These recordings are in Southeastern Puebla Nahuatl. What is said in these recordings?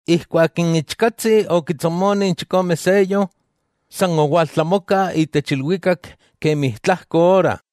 Ijkuak n Ichkatsi okitsomoni n chikome seyo, san owaltlamoka itech ilwikak kemi tlajko ora.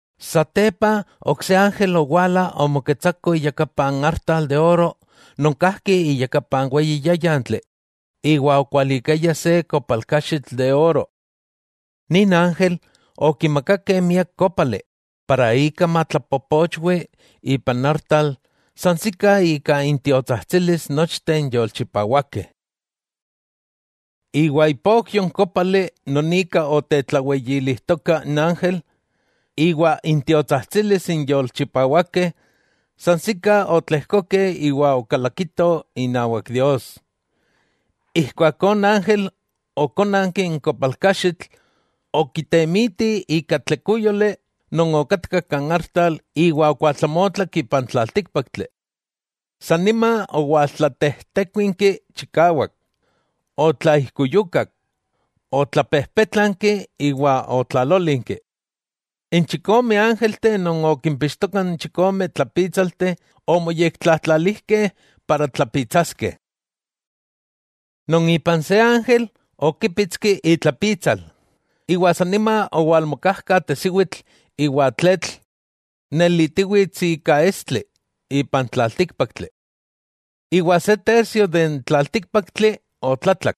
Satepa ok se ángel owala omoketsako iyakapa n artal de oro non kajki iyakapa n weyi yáyantli iwa okualikaya se kopalkaxitl de oro. Nin ángel okimakakeh miak kópali para ika matlapopochwi ipan artal sansikah ika intiotsajtsilis nochteh n yolchipawakeh. Iwa ipokyo n kópali non ika otetlaweyilijtoka n ángel, iwa intiotsajtsilis n yolchipawakeh, sansikah otlejkokeh iwa okalakitoh inawak Dios. Ijkuakó n ángel okónanki n kopalkaxitl, okitemiti ika tlekúyoli non okatka kan artal iwa okualtlamotlak ipan tlaltíkpaktli. San nima owaltlatejtekuinki chikawak, otlaijkuyukak, otlapejpétlanki iwa otlalólinki. N chikome ángelteh non okimpixtokah n chikome tlapítsalteh omoyektlatlalijkeh para tlapitsaskeh. Non ipan se ángel okípitski itlapitsal, iwa san nima owalmokajka tesiwitl iwa tletl nelitiwits ika estli ipan tlaltíkpaktli. Iwa se tercio de n tlaltíkpaktli otlatlak.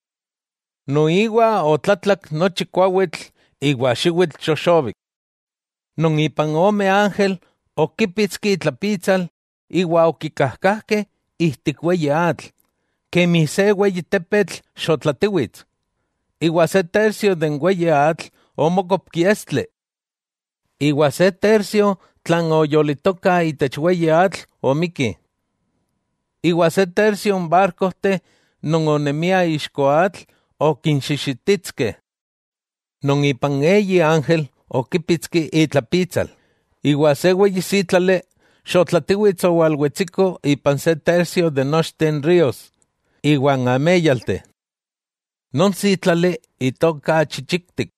Nochi kuawitl iwa xiwitl xoxobik otlatlak. Non ipan ome ángel okípitski itlapitsal, iwa okikajkajkeh ijtik weyi atl, kemi se weyi tepetl xotlatiwits, iwa se tercio de n weyi atl omókopki estli. Iwa se tercio tlan oyolitoka itech weyi atl omikki, iwa se tercio n barkojteh non onemiah ixko atl okinxixititskeh. Non ipan eyi ángel okípitski itlapitsal, iwa se weyi sítlali xotlatiwits owalwetsiko ipan se tercio itech nochteh n rios iwa n améyalteh. Non sítlali itoka Chichiktik.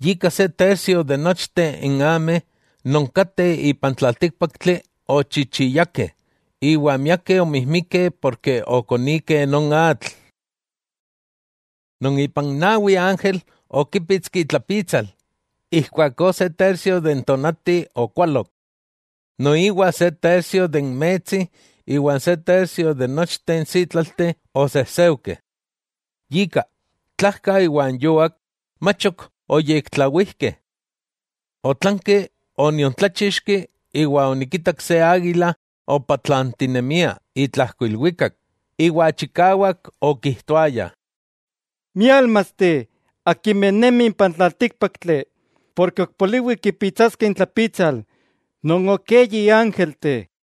Yika se tercio itech nochteh n ameh non kateh ipan tlaltíkpaktli ochichiyakeh, iwa miakeh omijmikeh porke okonikeh non atl. Non ipan nawi ángel okípitski itlapitsal, ijkuakó se tercio n tónati okualok, noiwa se tercio n metsi iwa n se tercio nochteh n sítlalteh osejseujkeh. Yika, tlajka iwa n yuak mach ok oyektlawijkeh. Otlanki oniontláchixki, iwa onikitak se águila opatlantinemia itlajko ilwikak, iwa chikawak okijtoaya: —¡Miálmasteh akimeh nemih ipan tlaltíkpaktli, porke ok poliwi kipitsaskeh intlapitsal non ok eyi ángelteh!